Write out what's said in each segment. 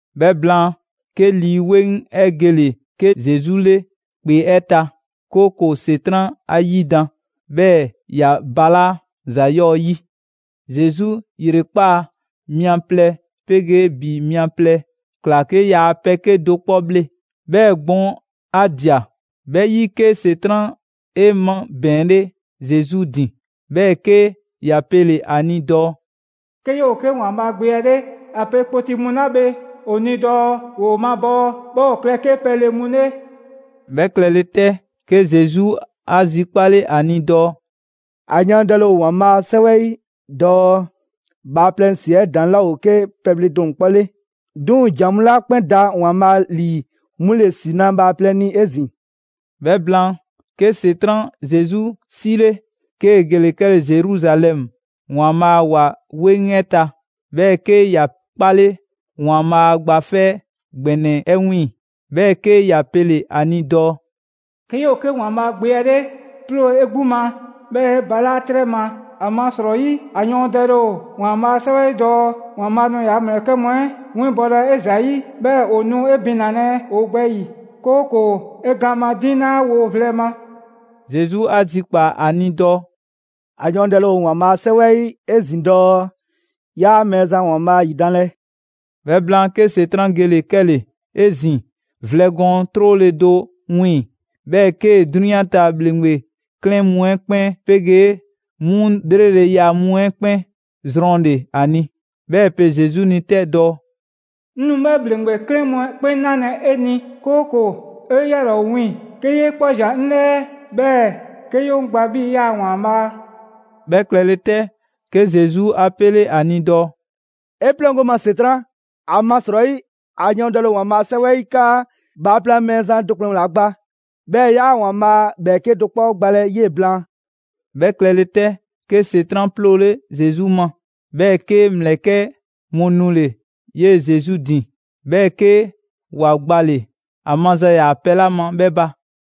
'Bhɛ blaan, 'ke Lii 'Weŋ 'ɛ gele‑ 'ke Zesu 'le ‑kpe 'ɛ ta, 'kooko‑ ‑Setran' 'a 'yidan‑, 'bhɛɛ‑ ‑ya balaa' ‑za 'yɔɔ‑ 'yi. Zesu ‑yrekpaa' mia plɛ 'pegee ‑bi mia plɛ ꞊kla 'ke yaa pɛ 'kedo‑ 'kpɔ bhle. 'Bhɛɛ‑ gbɔn 'a ꞊dia. 'Bhɛ 'yi, 'ke ‑Setran' 'e 'mabɛɛnle Zesu ‑din, 'bhɛɛ‑ 'ke ‑ya pele‑ ‑a ni dɔɔ: «'Ke 'yoo‑ 'ke ‑Waanbhaa' Gbe 'ɛ 'le, ‑a pe kpoti mu 'la bhe ‑o ni dɔɔ ‑woo mabɔɔ 'bhɛɛ‑ ‑o klɛ 'ke pɛle mu 'le» 'Bhɛ klɛle 'tɛ, 'ke Zesu 'a zikpale ‑a ni dɔɔ: «‑A yɔɔndɛle ‑o ‑Waanbhaa' 'a 'Sɛwɛ 'ɛ 'yi dɔɔ: ‹Bhaaplɛŋ ‑si 'ɛ ‑daŋ' 'laa ‑o 'ke pɛle do ‑kplɛnnɛ' 'le; 'duŋ‑ ‑jan mu 'la 'kpɛn da ‑Waanbhaa' ‑lii 'mu ‑le ‑si na bhaaplɛŋ ni 'ezin‑.›» 'Bhɛ blaan, 'ke ‑Setran' Zesu 'sile, 'kee‑ gele‑ 'kɛle‑ Zeruzalɛmu ‑Waanbhaa' a ‑wa 'weŋ 'ɛ ta; 'bhɛɛ‑ 'ke ‑ya 'kpale ‑Waanbhaa' Gba 'Fɛ ‑Gbɛnɛ 'ɛ 'wiiŋ‑. 'Bhɛɛ‑ 'ke ‑ya pele‑ ‑a ni dɔɔ: «'Kee‑ 'yoo‑ 'ke ‑Waanbhaa' Gbe 'ɛ ‑le, 'ploo 'e 'gbu ma 'bhɛɛ‑ 'e balaa' 'trɛ ma. ‑Amasrɔyi ‑a yɔɔndɛle ‑o Waanbhaa' a 'Sɛwɛ 'yi dɔɔ: ‹‑Waanbhaa' nu ‑yaa' ‑mlɛkɛ' mu 'ɛ winbɔlɛ 'e ‑zayi'. 'Bhɛɛ‑ ‑o nu 'e binalɛ ‑o gbɛ ‑yi, 'kooko‑ 'e gaan madiŋ 'laa wo vlɛ ma.›» Zesu 'a zikpaa‑ ‑a ni dɔɔ: «‑A yɔɔndɛle ‑o ‑Waanbhaa' a 'Sɛwɛ 'ɛ 'yi 'ezin‑ dɔɔ: ‹'Yaa Mɛɛzan ‑Waanbhaa' ‑yidanlɛ.›» 'Bhɛ blaan, 'ke ‑Setran' gele‑ 'kɛle‑ 'ezin‑ vlɛ gɔɔn 'trole‑ do 'wiiŋ‑, 'bhɛɛ‑ 'kee‑ 'drunyan ta ‑bhleŋgbe 'klɛɛn mu 'ɛ 'kpɛn 'pegee 'mu 'lreleya mu 'ɛ 'kpɛn zrɔnle‑ ‑a ni. 'Bhɛɛ‑ ‑e pe Zesu ni 'tɛ dɔɔ: «'Ŋ nu 'bhɛ ‑bhleŋgbe 'klɛɛn mu 'ɛ 'kpɛn 'nalɛ‑ 'e ni, 'kooko‑ 'e yalaa' ‑o wiiŋ, 'ke 'yee 'kpɔ ꞊zian 'ŋ 'lɛɛ, 'bhɛɛ‑ 'ke 'ye 'ŋ ‑gbaa 'bhii‑ 'yaa‑ ‑waanbhaa'.» 'Bhɛ klɛle 'tɛ, 'ke Zesu 'a 'pele 'a ni dɔɔ: «'E 'pleŋgo‑ 'ŋ ma ‑Setran'! ‑Amasrɔyi, ‑a yɔɔndɛle ‑o ‑Waanbhaa' a 'Sɛwɛ 'yi 'kaa: ‹Bhaaplɛŋ Mɛɛzan do ‑kplɛnnɛ' ‑la gba, 'bhɛɛ‑ 'yaa ‑Waanbhaa' ‑bhɛɛke' do 'kpɔ gbalɛ 'yee‑ blaan.›» 'Bhɛ klɛle 'tɛ, 'ke ‑Setran' 'ploole Zesu ma. 'Bhɛɛ‑ 'ke ‑mlɛkɛ' mu nule‑ 'yee‑ Zesu ‑din, 'bhɛɛ‑ 'ke ‑wa gbale‑ ‑a maza ‑yaa pɛ 'la ma 'bhɛ ba.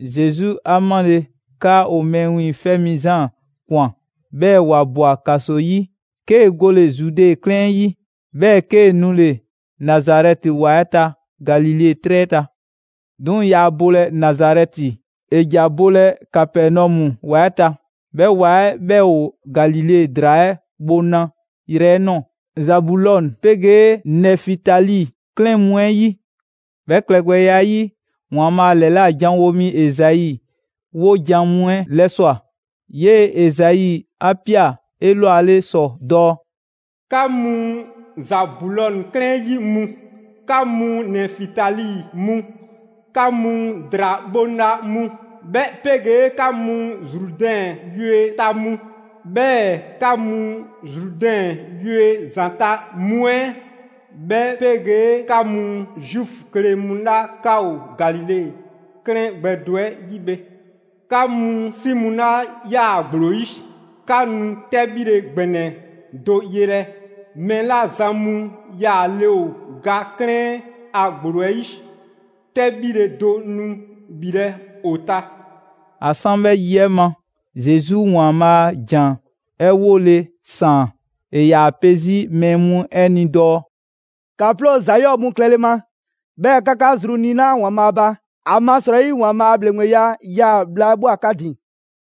Zesu 'a 'male‑ 'kaa ‑o Mɛɛ Wiiŋfɛ' Mi Zaan ꞊kwan, 'bhɛɛ‑ ‑wa ꞊bwa ‑kaso 'yi, 'kee‑ gole‑ Zude 'klɛɛn 'ɛ 'yi, 'bhɛɛ‑ 'kee‑ nule‑ Nazarɛti ‑wa 'ɛ ta Galile 'trɛ 'ɛ ta. 'Duŋ‑ yaa bolɛ Nazarɛti, ‑e ‑ja bolɛ Kapɛnɔmu ‑wa 'ɛ ta. 'Bhɛ ‑wa 'ɛ 'bhɛ ‑o Galile ‑draa 'ɛ bhoŋla yrɛ 'ɛ ꞊nɔɔ, Zabulɔn 'pegee Nɛfitali 'klɛɛn mu 'ɛ 'yi. 'Bhɛ klɛgbɛya 'ɛ 'yi, ‑Waanbhaa' ‑lɛla' janwo mi Ezai 'wojan‑ mu 'ɛ 'lɛswa꞊; 'yee‑ Ezai 'a ꞊pia 'elwale ‑sɔ dɔɔ: «'Ka mu Zabulɔn 'klɛɛn 'yi mu, 'ka mu Nɛfitali mu, 'ka mu ‑draa bhoŋla mu, 'bhɛ 'pegee 'ka mu Zrudɛn yue ta mu, 'bhɛɛ‑ 'ka mu Zrudɛn yue ‑zanta' mu 'ɛ, 'bhɛ 'pegee 'ka mu Zuufu kle mu 'la 'ka ‑o Galile 'klɛɛn gbɛ do 'ɛ 'yi bhe! 'Ka mu 'si mu 'la 'yaa‑ ‑gblo 'yi, 'ka nu 'tɛbhile ‑gbɛnɛ do yelɛ! Mɛɛ 'la zan mu yaale ‑o ga 'klɛɛn a ‑gblo 'ɛ 'yi, 'tɛbhile do nu ‑bhilɛ' ‑o ta!» ‑A 'san 'bhɛ yi 'ɛ ma, Zesu ‑Waanbhaa' a ‑jan 'ɛ 'wole‑ ‑saan. ‑E ‑yaa pe 'zi mɛɛ mu 'ɛ ni dɔɔ: «‑Ka 'ploo ‑za 'yɔɔ‑ mu klɛle ma, 'bhɛɛ‑ 'ka 'ka zru niina‑ ‑Waanbhaa' ba, ‑amasrɔyi ‑Waanbhaa' a ‑bhleŋgbeya 'yaa‑ bhla 'ɛ ꞊bhwa 'ka ‑din!»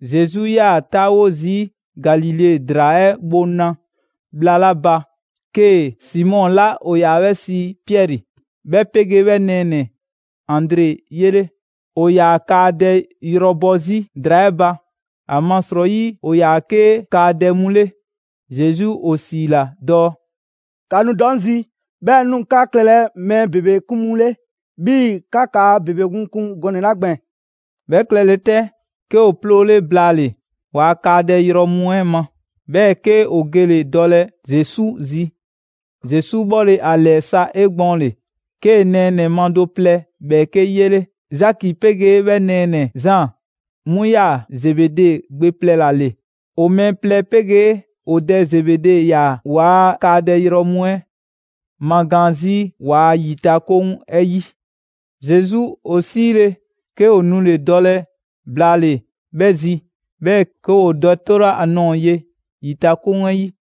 Zesu 'yaa‑ 'taawo zii' Galile ‑draa 'ɛ bhoŋla bhla 'la ba, 'kee‑ Simɔ 'la ‑o ‑yaa 'bhɛ sii Piɛri 'bhɛ 'pegee 'bhɛ nɛɛnɛ‑ Andre 'yele. ‑O ‑yaa kaadɛ yrɔ bɔ 'zi ‑draa 'ɛ ba, ‑amasrɔyi ‑o ‑yaa 'ke kaadɛ mu 'le. Zesu ‑o ‑siila dɔɔ: «‑Ka nu dɔ 'ŋ zi, 'bhɛɛ‑ 'ŋ nu 'ka klɛlɛ mɛɛ ‑bebe 'kun mu 'le 'bhii‑ 'ka kaa ‑bebe mu kun gɔnɛ‑ 'la gbɛɛn‑.» 'Bhɛ klɛle 'tɛ, 'ke ‑o 'ploole blaale‑ ‑waa' kaadɛ yrɔ mu 'ɛ ma, 'bhɛɛ‑ 'ke ‑o gele‑ dɔlɛ Zesu zi. Zesu 'bhɔle‑ ‑a ‑lɛɛ sa 'egbɔɔnle, 'kee‑ nɛɛnɛ‑ ma do plɛ ‑bhɛɛke' 'yele, Zaki 'pegee 'bhɛ nɛɛnɛ‑ Zaan; 'mu 'yaa‑ Zebede gbe plɛ ‑la ‑le. ‑O mɛɛ plɛ 'pegee ‑o dɛ Zebede ‑yaa ‑waa' kaadɛ yrɔ mu 'ɛ magaan 'zi ‑waa' ‑yitakoŋ 'ɛ 'yi. Zesu ‑o 'siile‑, 'ke ‑o nule‑ dɔlɛ blaale‑ 'bhɛ zi, 'bhɛɛ‑ 'ke ‑woo dɛ 'tole 'a nɔɔ‑ ye ‑yitakoŋ 'ɛ 'yi.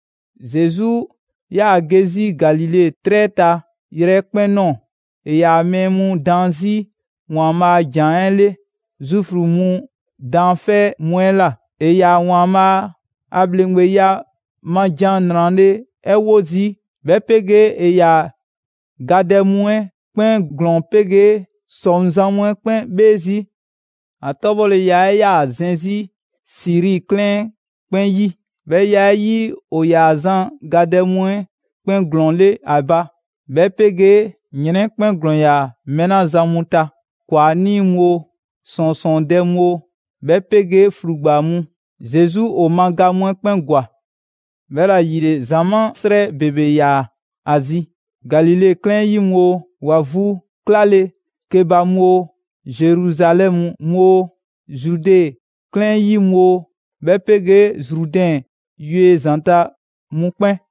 Zesu 'yaa‑ ge 'zi Galile 'trɛ ta yrɛkpɛn‑ ꞊nɔɔ; ‑e ‑yaa mɛɛ mu daan 'zi ‑Waanbhaa' a ‑jan 'ɛ 'le Zuufu mu daanfɛ' mu 'ɛ ꞊la, ‑e ‑yaa ‑Waanbhaa' a ‑bhleŋgbeya ma ‑jan 'nrale‑ 'ɛ 'wo zii'; 'bhɛ 'pegee ‑e ‑yaa gadɛ mu 'ɛ 'kpɛn ‑glɔɔn 'pegee ‑sɔŋzan' mu 'ɛ 'kpɛn 'bhee zii'. ‑A 'tɔbhɔleya 'ɛ 'yaa‑ zɛn 'zi Siri 'klɛɛn 'ɛ 'kpɛn 'yi. 'Bhɛ ya 'ɛ 'yi, ‑o ‑yaa zan gadɛ mu 'ɛ 'kpɛn ‑glɔɔn 'le ‑a ba, 'bhɛ 'pegee ‑yrɛn 'ɛ 'kpɛn ‑glɔɔn ‑yaa mɛɛ 'la zan mu ta: ‑Kwanii' mu oo, ‑sɔɔnsɔɔndɛ mu oo, 'bhɛ 'pegee ‑flugba mu. Zesu ‑o ma ga mu 'ɛ 'kpɛn ‑gwa. 'Bhɛla‑ ‑yile, ‑zamaa' 'srɛ ‑bebe ‑yaa ‑a zi: Galile 'klɛɛn 'yi mu oo, ‑wa vu 'klale‑ ke ba mu oo, Zeruzalɛmu mu oo, Zude 'klɛɛn 'yi mu oo, 'bhɛ 'pegee Zrudɛn yue ‑zanta' mu 'kpɛn.